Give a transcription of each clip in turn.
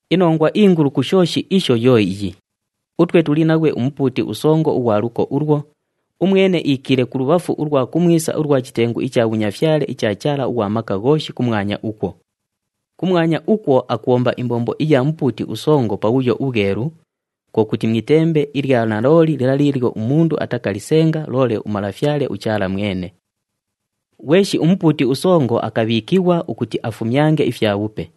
Inongwa ingulu ku shooshi isho yo iyi, utwe tuli naghwe uMupuuti uSongo ughwa luko ulwo, umwene iikiile kulubhafu ulwa kumwisa ulwa chitengu icha bhunyafyale icha Chaala ughwa Maka Ghooshi kumwanya ukwo. Kumwanya ukwo akubhomba imbombo iya Mupuuti uSongo Pabhuyo uBhwelu, kwo kuti mu itembe ilya nalooli lila liilyo umundu atakalisenga loole uMalafyale uChaala mwene. Ghweshi umupuuti usongo akabhiikighwa ukuti afumyange ifyabhupe,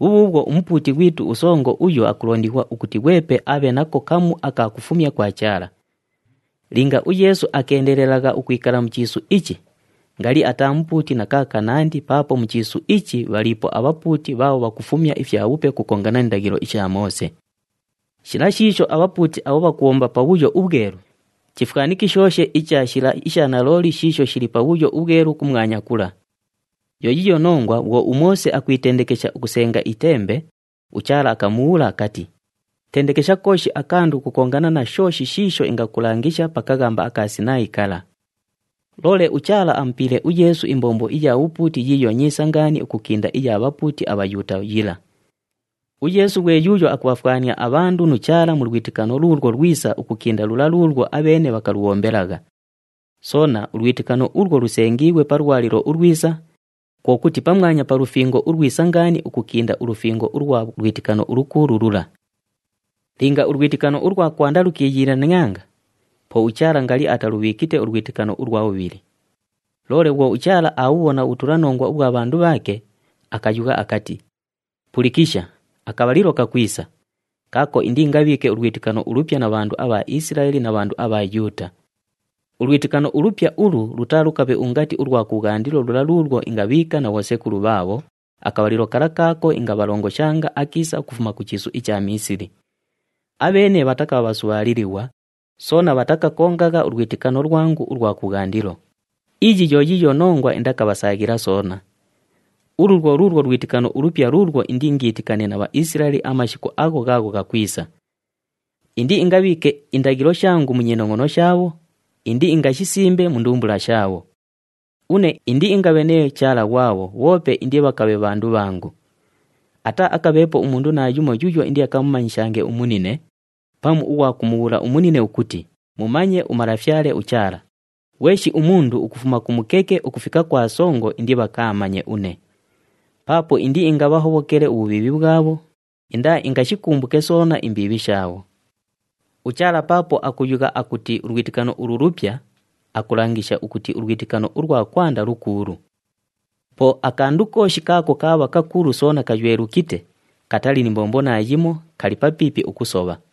bhubhuubhwo uMupuuti ghwitu uSongo uyo akulondighwa ukuti ghwepe abhe nako kamu aka kufumya kwa Chaala. Linga uYeesu akeendelelagha ukwikala mu chiisu ichi, ngali ataa Mupuuti na kaakanandi paapo mu chiisu ichi bhaliipo abhapuuti bhaabho bhakufumya ifyabhupe ukukongana ni ndaghilo isha Moose. Shila shiisho abhapuuti abho bhakubhomba Pabhuyo uBhwelu, chifwanikishooshe icha shila isha nalooli shiisho shili Pabhuyo uBhwelu kumwanya kula. Yo yiiyo nongwa bhwo uMoose akwitendekesha ukusenga itembe, uChaala akamubhuula akati, “Tendekesha kooshi akandu ukukongana na shooshi shiisho ingakulangisha pa kaghamba aka Sinaayi kala.” Loole uChaala amupiile uYeesu imbombo iya bhupuuti yiiyo nyiisa ngaani ukukinda iya bhapuuti aBhayuuta yila. UYeesu ghwe yuuyo akubhafwania abhandu nu Chaala mu lwitikano luulwo lwisa ukukinda lula luulwo abheene bhakalubhombelagha. Soona, ulwitikano ulwo lusengiighwe pa lwalilo ulwisa, kwo kuti pamwanya pa lufingo ulwisa ngaani ukukinda ulufingo ulwa lwitikano ulukuulu lula. Linga ulwitikano ulwa kwanda lukiiyiilanianga, po uChaala ngali atalubhiikite ulwitikano ulwa bhubhili. Loole bhwo uChaala aabhubhona ubhutulanongwa ubhwa bhandu bhaake, akayugha akati, “Pulikisha, akabhalilo kakwisa, kaako indiingabhiike ulwitikano ulupya na bhandu abha Isilaeli na bhandu abha Yuuta. Ulwitikano ulupya ulu lutaalukabhe ungati ulwa kubhwandilo lula luulwo ingabhiika na bhosekulu bhaabho akabhalilo kala kaako ingabhalongoshanga akiisa ukufuma ku chiisu icha Miisili. Abheene bhatakabha bhasubhaalilighwa, soona bhatakakongagha ulwitikano lwangu ulwa kubhwandilo. Iyi yo yiiyo nongwa indakabhasaaghila soona. Ulu lwo luulwo lwitikano ulupya luulwo indiingiitikane na Bhaisilaeli amashiku agho ghaagho ghakwisa. Indiingabhiike indaghilo shangu mu nyinongʼono shaabho, indiingashisimbe mu ndumbula shaabho. Une indiingabhe nee Chaala ghwabho bhoope indibhakabhe bhandu bhangu. Ataaakabheepo umundu naayumo yuuyo indiakamumanyishange umunine, pamu ughwa kumubhuula umunine ukuti, ‘Mumanye uMalafyale uChaala.’ Ghweshi umundu ukufuma ku mukeke ukufika kwa songo indibhakaamanye une. Paapo indiingabhahobhokele ubhubhiibhi bhwabho, indaaingashikumbuke soona imbiibhi shaabho.” UChaala paapo akuyugha akuti ulwitikano ulu “lupya,” akulangisha ukuti ulwitikano ulwa kwanda “lukuulu.” Po akandu kooshi kaako kaabha kakuulu soona kaywelukite, katali ni mbombo naayimo, kali papiipi ukusobha.